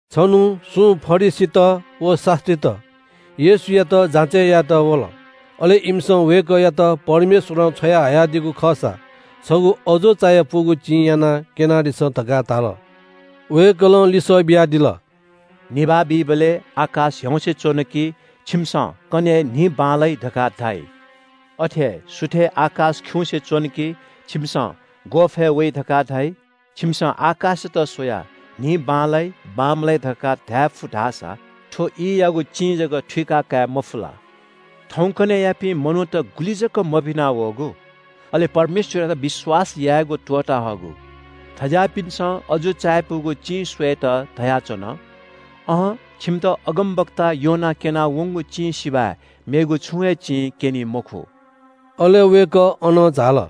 छन्‍हु सुं फरिसीत व शास्‍त्रीत येशूयात जाँचय् यायेत वल। अले इमिसं वय्‌कःयात परमेश्‍वरं छ्वयाहयादीगु खःसा छगू अजू चायापुगु चिं यानाः क्‍यनादिसँ धकाः धाल। वय्‌कलं लिसः बियादिल – “निभाः बीबलय् आकाश ह्याउँसे च्‍वन कि छिमिसं ‘कन्‍हय् दिं बांलाइ’ धकाः धाइ। अथे हे सुथय् आकाश खिउँसे च्‍वन कि छिमिसं ‘ग्‍वःफय् वइ’ धकाः धाइ। छिमिसं आकाशयात स्‍वयाः थौंयागु दिं गथे जुइ धकाः धायेफु धाःसा थ्‍व ईयागु चिं जक थुइका कायेमफु ला? थौंकन्‍हय्‌यापिं मनूत गुलि जक मभिना वःगु, अले परमेश्‍वरयात विश्‍वास यायेगु त्‍वःता हःगु। थज्‍याःपिन्‍सं अजू चायापुगु चिं स्‍वयेत धयाच्‍वन। अहं, छिमित अगमवक्ता योनां क्‍यना वंगु चिं सिबय् मेगु छुं हे चिं क्‍यनी मखु।” अले वय्‌कः अनं झाल।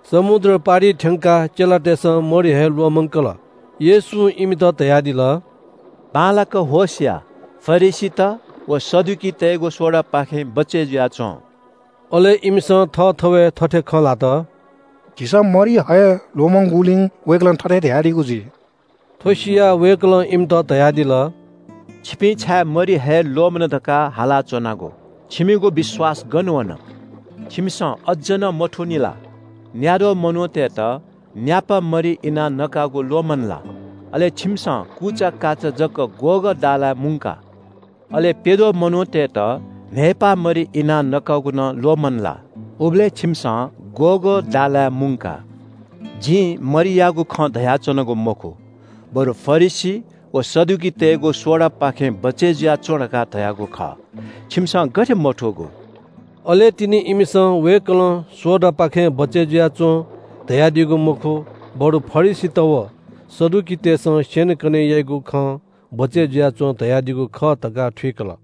समुद्र पारिइ थ्‍यंकाः चेलातय्‌सं मरि हये ल्‍वःमंकल। येशूं इमित धयादिल – “बांलाक होश या, फरिसीत व सदुकीतय्‌गु सोडापाखें बचय् जुयाच्‍वँ।” अले इमिसं थःथवय् थथे खँ ल्‍हात – “झीसं मरि हये ल्‍वःमंगुलिं वय्‌कलं थथे धयादीगु जुइ।” थ्‍व सियाः वय्‌कलं इमित धयादिल – “छिपिं छाय् मरि हये ल्‍वःमन धकाः हालाच्‍वनागु? छिमिगु विश्‍वास गन वन? छिमिसं अज्‍ज नं मथूनि ला? न्‍याद्वः मनूतय्‌त न्‍यापा मरि इनाः नकागु ल्‍वःमन ला? अले छिमिसं कुचाकाचा जक ग्‍वःगः दालाय् मुंका? अले प्‍यद्वः मनूतय्‌त न्‍हय्‌पाः मरि इनाः नकागु नं ल्‍वःमन ला? उबलय् छिमिसं ग्‍वःगः दालाय् मुंका? जिं मरियागु खँ धयाच्‍वनागु मखु, बरु फरिसी व सदुकीतय्‌गु सोडापाखें बचय् जुयाच्‍वँ धकाः धयागु खः। छिमिसं गथे मथूगु?” अले तिनि इमिसं वय्‌कलं सोडापाखें बचय् जुयाच्‍वँ धयादीगु मखु, बरु फरिसीत व सदुकीतय्‌सं स्‍यनेकने याइगु खं बचय् जुयाच्‍वँ धयादीगु खः धकाः थुइकल।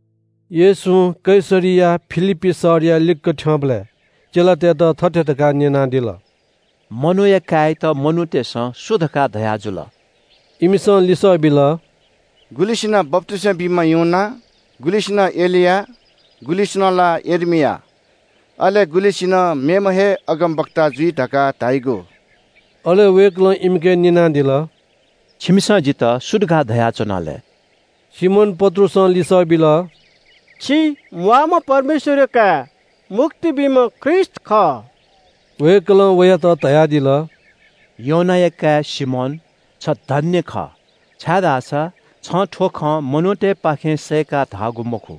येशूं कैसरिया फिलिप्‍पी शहरया लिक्‍क थ्‍यंबलय् चेलातय्‌त थथे धकाः न्‍यनादिल – “मनूया काय्‌यात मनूतय्‌सं सु धकाः धयाजुल?” इमिसं लिसः बिल – “गुलिसिनं बप्‍तिस्‍मा बीम्‍ह यूहन्‍ना, गुलिसिनं एलिया, गुलिसिनं ला यर्मिया, अले गुलिसिनं मेम्‍ह हे अगमवक्ता जुइ धकाः धाइगु।” अले वय्‌कलं इमिके न्‍यनादिल – “छिमिसं जितः सु धकाः धयाच्‍वना लय्?” सिमोन पत्रुसं लिसः बिल – “छि म्‍वाःम्‍ह परमेश्‍वरया काय्, मुक्ति बीम्‍ह ख्रीष्‍ट खः।” वय्‌कलं वयात धयादिल – “योनाया काय् सिमोन, छ धन्‍य खः, छाय्‌धाःसा छं थ्‍व खँ मनूतय्‌पाखें सय्‌काः धाःगु मखु,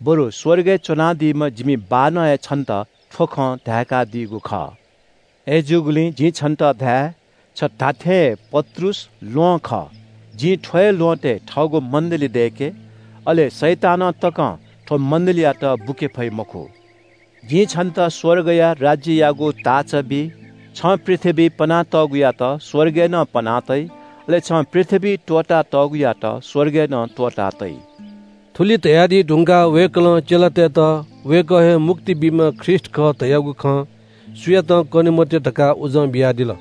बरु स्‍वर्गय् च्‍वनादीम्‍ह जिमि बाःनं हे छन्‍त थ्‍व खँ धाय्‌कादीगु खः। अथे जूगुलिं जिं छन्‍त धाये, छ धात्‍थें हे पत्रुस ल्‍वहं खः। जिं थ्‍व हे ल्‍वहँतय् थःगु मण्‍डलीदय्‌के। अले शैतानं तकं थ्‍व मण्‍डलीयात बुके फइ मखु। जिं छन्‍त स्‍वर्गया राज्‍ययागु ताःचा बी। छं पृथ्‍वीइ पना तःगुयात स्‍वर्गय् नं पना तइ, अले छं पृथ्‍वीइ त्‍वःता तःगुयात स्‍वर्गय् नं त्‍वःता तइ।” थुलि धयादी धुंकाः वय्‌कलं चेलातय्‌त वय्‌कः हे मुक्ति बीम्‍ह ख्रीष्‍ट खः धयागु खँ सुयातं कने मते धकाः उजं बियादिल।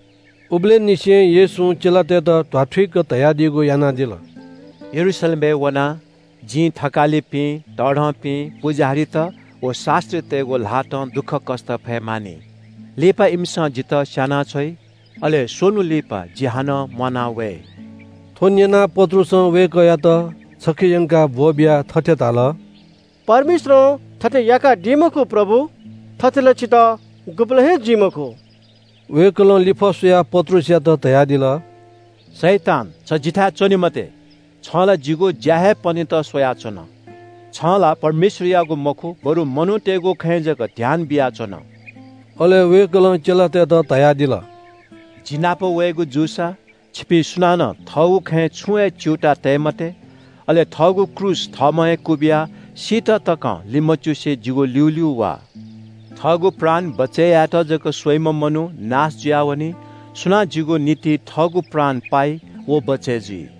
उबलय् निसें येशूं चेलातय्‌त ध्‍वाथुइक धयादीगु यानादिल – “यरूशलेमय् वनाः जिं थकालिपिं, तःधंपिं पुजाहारीत व शास्‍त्रीतय्‌गु ल्‍हातं दुःखकष्‍ट फये मानि। लिपा इमिसं जितः स्‍यानाछ्वइ। अले स्‍वन्‍हु लिपा जि हानं म्‍वाना वये।” थ्‍व न्‍यनाः पत्रुसं वय्‌कःयात छखे यंकाः ब्‍वःबियाः थथे धाल – “परमेश्‍वरं थथे याकादी मखु, प्रभु, थथे ला छितः गुबलें हे जुइ मखु।” वय्‌कलं लिफः स्‍वयाः पत्रुसयात धयादिल – “शैतान, छ जिथाय् च्‍वने मते। छं ला जिगु ज्‍या हे पनेत स्‍वयाच्‍वन। छं ला परमेश्‍वरयागु मखु, बरु मनूतय्‌गु खँय् जक ध्‍यान बियाच्‍वन।” अले वय्‌कलं चेलातय्‌त धयादिल – “जि नाप वयेगु जूसा छिपिं सुनानं थःगु खँय् छुं हे च्‍यूताः तये मते। अले थःगु क्रूस थःम्‍हं हे क्‍वबिया सीत तकं लिमच्‍युसे जिगु ल्‍यूल्‍यू वा। थःगु प्राण बचय् यायेत जक स्‍वइम्‍ह मनू नाश जुयावनी। सुनां जिगु निंतिं थःगु प्राण पाइ व बचय् जुइ।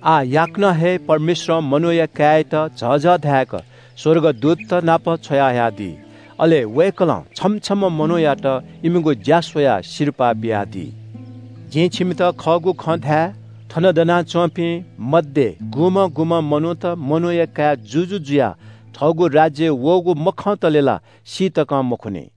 आः याकनं हे परमेश्‍वरं मनूया काय्‌यात झःझः धाय्‌क स्‍वर्गदूतत नाप छ्वयाहयादी। अले वय्‌कलं छम्‍ह छम्‍ह मनूयात इमिगु ज्‍या स्‍वयाः सिरपाः बियादी। जिं छिमित खःगु खँ धाये – थन दनाच्‍वंपिं मध्‍ये गुलिखय्‌ मनूत मनूया काय् जुजु जुयाः थःगु राज्‍यय् वःगु मखंतले ला सी तकं मखुनि।”